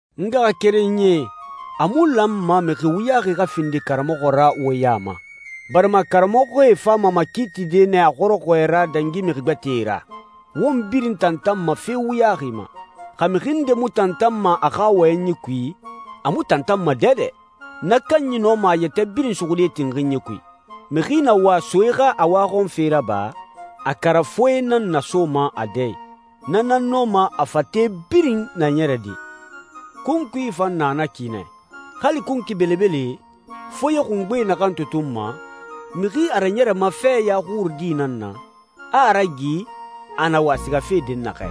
N ngaxakerenyie, a mu lanma mixi wuyaxi xa findi karamɔxɔ ra wo ya ma, barima karamɔxɔe fama makiitide nɛ a xɔrɔxɔɛ ra dangi mixi gbɛtɛe ra. Won birin tantanma fe wuyaxi ma. Xa mixi nde mu tantanma a xa wɔyɛnyi kui, a mu tantanma dɛdɛ. Na kanyi nɔma a yɛtɛ birin suxude tinxinyi kui. Mixi na wa soe xa a waxɔnfe raba, a karafoe nan nasoma a dɛ i. Na nan nɔma a fate birin naɲɛrede. Kunkui fan na na ki nɛ. Hali kunkui belebele, foye xungbe naxan tutunma, mixi a raɲɛrɛma feya xurudi nan na, a a ragi a na wa sigafe dɛnnaxɛ.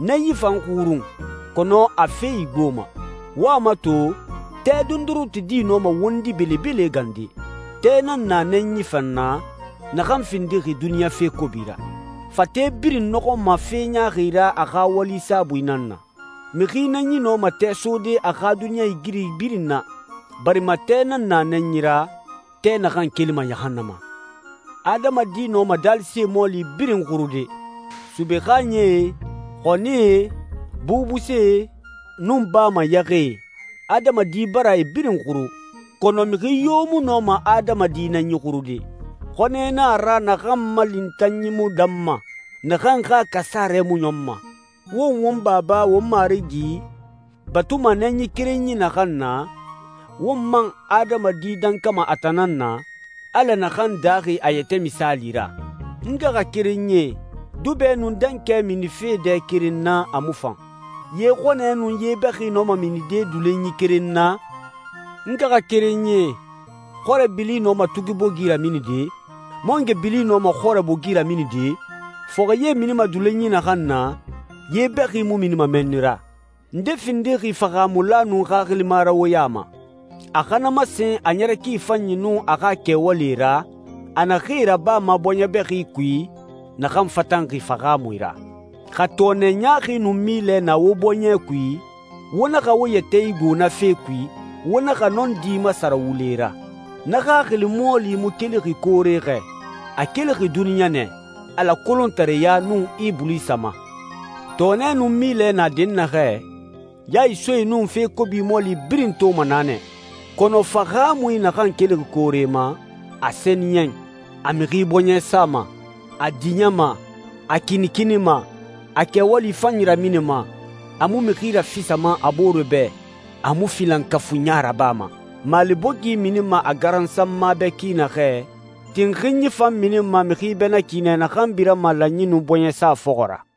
Nɛnyi fan xurun, kɔnɔ a fe igboma. Wo a mato, tɛ dondoronti di nɔma wondi belebele gande. Tɛ nan na nɛnyi fan na, naxan findixi duniɲa fe kobi ra. Fate birin nɔxɔma fe ɲaaxi ra a xa wali saabui nan na. Mixi nɛnyi nɔma tɛ sode a xa duniɲɛigiri birin na, barima tɛ nan na nɛnyi ra, tɛ naxan kelima yahannama. Adamadi nɔma daalise mɔɔli birin xurude. Sube xaaɲɛe, xɔnie, bubusee, nun baa ma yɛxɛe, adamadi bara e birin xuru, kɔnɔ mixi yo mu nɔma adamadi nɛnyi xurude. Xɔnɛ na a ra naxan ma lintanyi mu danma, naxan xa kasarɛ mu ɲɔnma. Won won Baba, won Marigi, batuma nɛnyi kerenyi naxan na, won man adamadi dankama a tan nan na, Ala naxan daaxi a yɛtɛ misaali ra. N ngaxakerenyie, dubɛ nun dankɛ minife dɛ keren na, a mu fan. Ye xɔnɛ nun ye bɛxi nɔma minide dulonyi keren na? N ngaxakerenyie, xɔrɛ bili nɔma tugi bogi raminide? Mangoe bili nɔma xɔrɛ bogi raminide? Fɔxɛ ye minima dulonyi naxan na, ye bɛxi mu minima mɛnni ra. Nde findixi fahaamula nun xaxilima ra wo ya ma? A xa na masen a ɲɛrɛ ki fanyi nun a xa kɛwalie ra, a naxee rabama bɔɲɛ bɛxi kui, naxan fatanxi fahaamui ra. Xa tɔɔnɛ ɲaaxi nun milɛ na wo bɔɲɛ kui, wo naxa wo yɛtɛ igbo na fee kui, wo naxa nɔndi masara wule ra. Na xaxili mɔɔli mu kelixi koore xɛ. A kelixi duniɲa nɛ, Ala kolontareya, nun Ibulisa ma. Tɔɔnɛ nun milɛ na dɛnnaxɛ, ya isoe nun fe kobi mɔɔli birin toma na nɛ. Kɔnɔ fahaamui naxan kelixi koore ma, a sɛniyɛn, a mixi bɔɲɛ sama, a diɲɛma, a kinikinima, a kɛwali fanyi raminima, a mu mixi rafisama a boore bɛ, a mu filankafuiɲa rabama. Maale bogi minima a garansanma bɛ ki naxɛ, tinxinyi fan minima mixi bɛ na ki nɛ naxan birama lanyi nun bɔɲɛsa fɔxɔ ra.